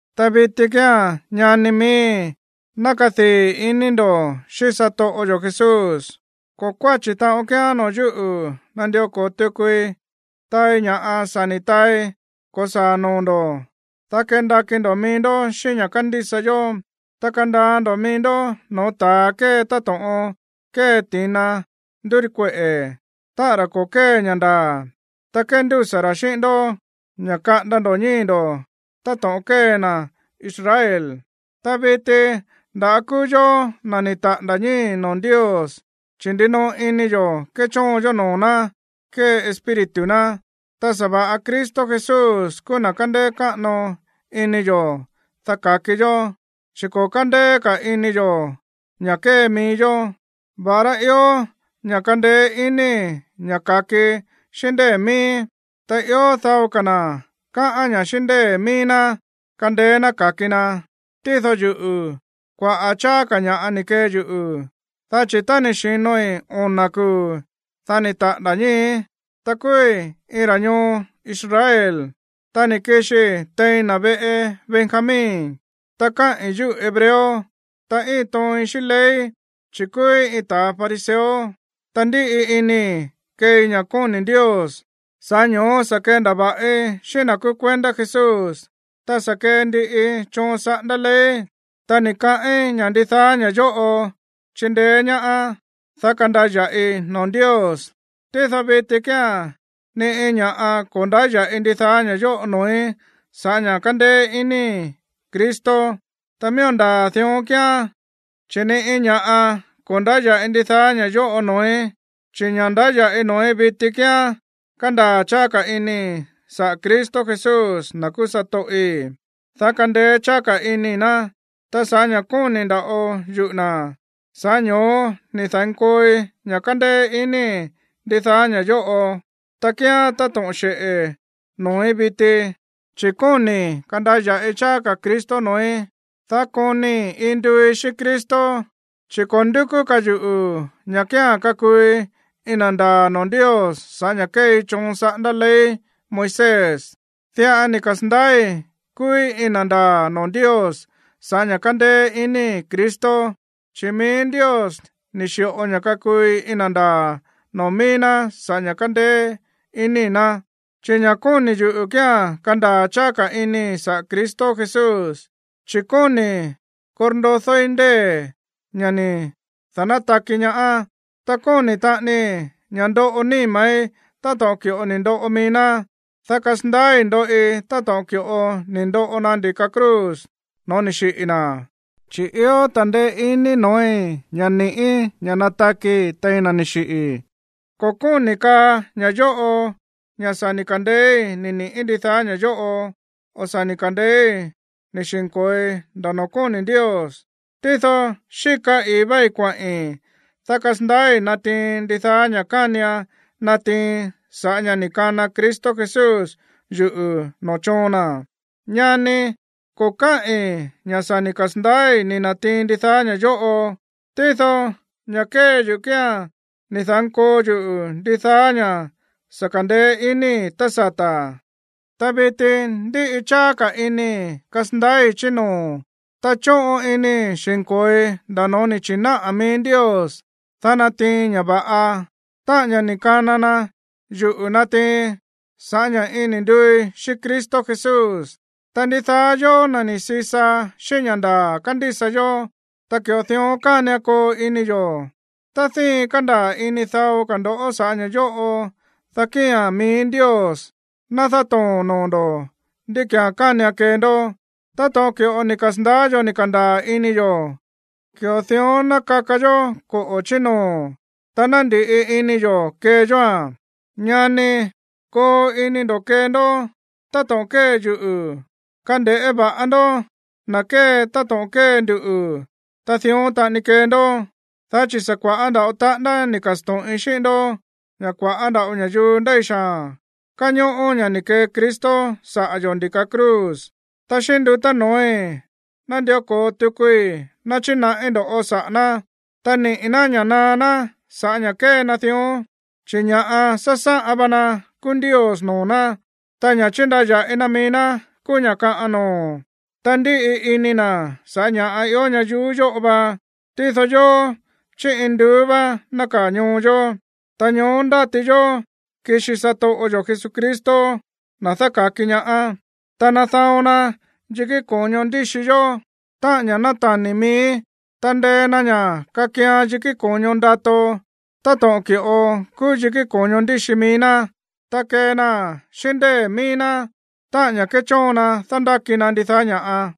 Ta viti kía̱n, ñani miíi̱, ná kadii̱ ini ndo̱ xíꞌín satoꞌo yo̱ Jesús. Ko̱ kuáchi̱ taꞌon kíán noo̱ yúꞌu̱ nandió ko̱o tukui taai ña̱ sa̱ ni̱ taai ko̱saa̱ noo̱ ndo̱, dá kendakí ndo̱ mií ndó xíꞌín ña̱ kándísa yó. Ta kandaa ndo̱ mií ndó noo̱ ta̱a kée táto̱ꞌon kée ti̱na ndúríkueꞌe̱, táꞌa̱n ra̱ ko̱ kée ña̱ ndaa̱, ta kéndúsa̱ ra̱ xíꞌín ndó ña̱ kaꞌanda ndo̱ ñíi̱ ndo̱ táto̱ꞌon kée na̱ Israel. Ta viti nda̱á kúú yó na̱ ni̱ taꞌa̱nda̱ ñíi̱ noo̱ Ndios, chi̱ ndinoꞌo ini yo̱ kéchóon yó noo̱ ná kée Espíritu ná, ta sa̱va̱ꞌa Cristo Jesús kúú na̱ kándéé káꞌano ini yo̱, dá ka̱ki yó, chi̱ ko̱ kándéé ka̱ ini yo̱ ña̱ kée mií yó, va̱ꞌará ió ña̱ kandeé iníi̱ ña̱ ka̱kii xíꞌín ndée̱ miíí. Tá ió dao ka̱ na̱ káꞌán ña̱ xíꞌín ndée̱ mií ná kandeé ná ka̱ki na, tído yuꞌu̱, kuaꞌa̱ cháá ka̱ ña̱ꞌa ni̱ kee yuꞌu̱, dá chi̱ tá ni̱ xi̱noi ona̱ kuu̱, dá ni̱ taꞌa̱nda̱ ñíi̱í, ta kúúí iin ra̱ ñoo Israel, ta ni̱ kixii tein na̱ veꞌe Benjamín, ta káꞌi̱n yúꞌu̱ hebreo, ta íin tooin xíꞌín ley, chi̱ kúúí iin ta̱ fariseo, ta ndíꞌi inii̱ keei ña̱ kóni̱ Ndios, sa̱ꞌá ño̱ó sa̱ kendava̱ꞌi xíꞌín na̱ kúú kuendá Jesús, ta sa̱ kee ndiꞌii choon saꞌándá ley. Ta ni̱ kaꞌín ña̱ ndidaá ña̱ yóꞌo chindeé ñaá, dá kandaya̱ꞌi noo̱ Ndios. Tído viti kíán ni iin ña̱ꞌa ko̱ ndáya̱ꞌi ndidaá ña̱ yóꞌo noo̱í sa̱ꞌá ña̱ kándéé inii̱ Cristo. Ta miía̱n ndaa̱ dión kíán, chi̱ ni iin ña̱ꞌa ko̱ ndáya̱ꞌi ndidaá ña̱ yóꞌo noo̱í, chi̱ ña̱ ndáya̱ꞌi noo̱í viti kía̱n kandaa̱ cháá ka̱ inii̱ saꞌa̱ Cristo Jesús, na̱ kúú satoꞌi̱, dá kandeé cháá ka̱ inii̱ ná. Ta sa̱ꞌá ña̱ kóni̱ nda̱ꞌo yuꞌu̱ na̱, sa̱ꞌá ño̱ó ni̱ da̱nkooi ña̱ kandeé inii̱ ndidaá ña̱ yóꞌo, ta kíán táto̱ꞌon xeꞌe̱ noo̱í viti, chi̱ kóni̱ kandaya̱ꞌi cháá ka̱ Cristo noo̱í, dá konii̱ iin nduúí xíꞌín Cristo, chi̱ ko̱ ndúkú ka̱ yuꞌu̱ ña̱ kía̱n kakuui iin na̱ ndaa̱ noo̱ Ndios sa̱ꞌá ña̱ kéei choon saꞌándá ley Moisés. Diꞌa ni̱ kasa̱ndaái̱ kúúí iin na̱ ndaa̱ noo̱ Ndios sa̱ꞌá ña̱ kándéé iníi̱ Cristo, chi̱ mií Ndios ni̱ xi̱ꞌo ña̱ kakuui iin na̱ ndaa̱ noo̱ mií ná sa̱ꞌá ña̱ kándéé iníi̱ ná. Chi̱ ña̱ kóni̱ yuꞌu̱ kía̱n kandaa̱ cháá ka̱ inii̱ saꞌa̱ Cristo Jesús, chi̱ kóni̱i̱ korndodóí ndée̱, ña̱ ni̱ da̱nátaki ñaá. Ta kóni̱ taꞌanii ña̱ ndoꞌo níma̱í táto̱ꞌon ki̱ꞌo ni̱ ndoꞌo mií ná, dá kasandaái̱ ndoꞌi táto̱ꞌon ki̱ꞌo ni̱ ndoꞌo na ndi̱ka cruz no̱ó ni̱ xiꞌi̱ na̱, chi̱ ió ta̱ndeé iní no̱ói̱ ña̱ ni̱ꞌí ña̱ natakii̱ tein na̱ ni̱ xiꞌi̱. Ko̱ kóni̱ kaa ña̱ yóꞌo ña̱ sa̱ ni̱ ka̱ndeéí ni̱ niꞌi̱ ndidaá ña̱ yóꞌo, o sa̱ ni̱ ka̱ndeéí ni̱ xi̱nko̱oi nda̱ noo̱ kóni̱ Ndios, tído xíka i̱í váí kuaꞌi̱n, dá kasandaái̱ natiiin ndidaá ña̱ kánian natiiin saꞌa̱ ña̱ ni̱ kana Cristo Jesús yuꞌu̱ noo̱ choon na̱. Ñanii̱, ko̱ káꞌi̱n ña̱ sa̱ ni̱ kasa̱ndaái̱ ni̱ na̱tiin ndidaá ña̱ yóꞌo, tído ña̱ kée yuꞌu̱ kía̱n ni̱ da̱nkoo yuꞌu̱ ndidaá ña̱ sa̱ ka̱ndeé inii̱ tá sata̱, ta viti ndíꞌi cháá ka̱ inii̱ kasandaái̱ chí noo̱, ta chóꞌon inii̱ xi̱nko̱oi nda̱ no̱ó ni̱ chi̱náꞌa̱ mií Ndios, dá natiiin ña̱ va̱ꞌa, táꞌa̱n ña̱ ni̱ kana na yuꞌu̱ natiiin sa̱ꞌá ña̱ iin ni̱ nduúí xíꞌín Cristo Jesús. Ta ndidaá yóó, na̱ ni̱ sisa xíꞌín ña̱ ndaa̱ kándísa yó, ta ki̱ꞌo dión kánian koo ini yo̱. Tá díin kándaa̱ ini dao ka̱ ndo̱ sa̱ꞌá ña̱ yóꞌo, dá kía̱n mií Ndios ná dátoo̱n noo̱ ndo̱ ndí ki̱án kánian kee ndó. Táto̱ꞌon ki̱ꞌo ni̱ kasa̱ndaá yo̱ ni̱ ka̱ndaa̱ ini yo̱, ki̱ꞌo dión ná kaka yó koꞌo̱ chí noo̱, ta ná ndi̱ꞌi ini yo̱ kee yóa̱n. Ñanii̱, koo ini ndo̱ kee ndó táto̱ꞌon kée yuꞌu̱. Kande̱ꞌé va̱ꞌa ndó na̱ kée táto̱ꞌon kée nduꞌu̱, ta dión taꞌani kee ndó. Dá chi̱ sa̱ kua̱ꞌá nda̱ꞌo taꞌándá ni̱ ka̱sto̱ꞌin xíꞌín ndó ña̱ kua̱ꞌá nda̱ꞌo ña̱yuu ndéi xaa̱n káñóꞌó ña̱ ni̱ kee Cristo saꞌa̱ yo̱ ndi̱ka cruz. Ta xíꞌín ndutá noo̱í nandió ko̱o tukui náchinaꞌí ndo̱ꞌó saꞌa̱ ná. Ta niꞌi̱ ná ña̱ naá ná sa̱ꞌá ña̱ kée na dión. Chi̱ ña̱ꞌa sásáꞌan va na kúú ndios noo̱ ná, ta ña̱ chíndaya̱ꞌi na mií ná kúú ña̱ kaꞌan noo̱, ta ndíꞌi ini na̱ sa̱ꞌá ña̱ꞌa ió ñayuú yóꞌo va. Tído yóó, chí induú vá nákaa̱ ñoo yo̱, ta ñoó ndáti yó kixi satoꞌo yo̱ Jesucristo, na̱ dáka̱ki ñaá, dá nadaon na yikí ko̱ño ndíxi yó, táꞌa̱n ña̱ náta̱ni̱ mií, ta ndee na ña̱ kakian yikí ko̱ño ndato táto̱ꞌon ki̱ꞌo kúú yikí ko̱ño ndíxi mií ná. Ta kee naa̱n xíꞌín ndée̱ mií ná, táꞌa̱n ña̱ kéchóon na dándáki na ndidaá ña̱ꞌa.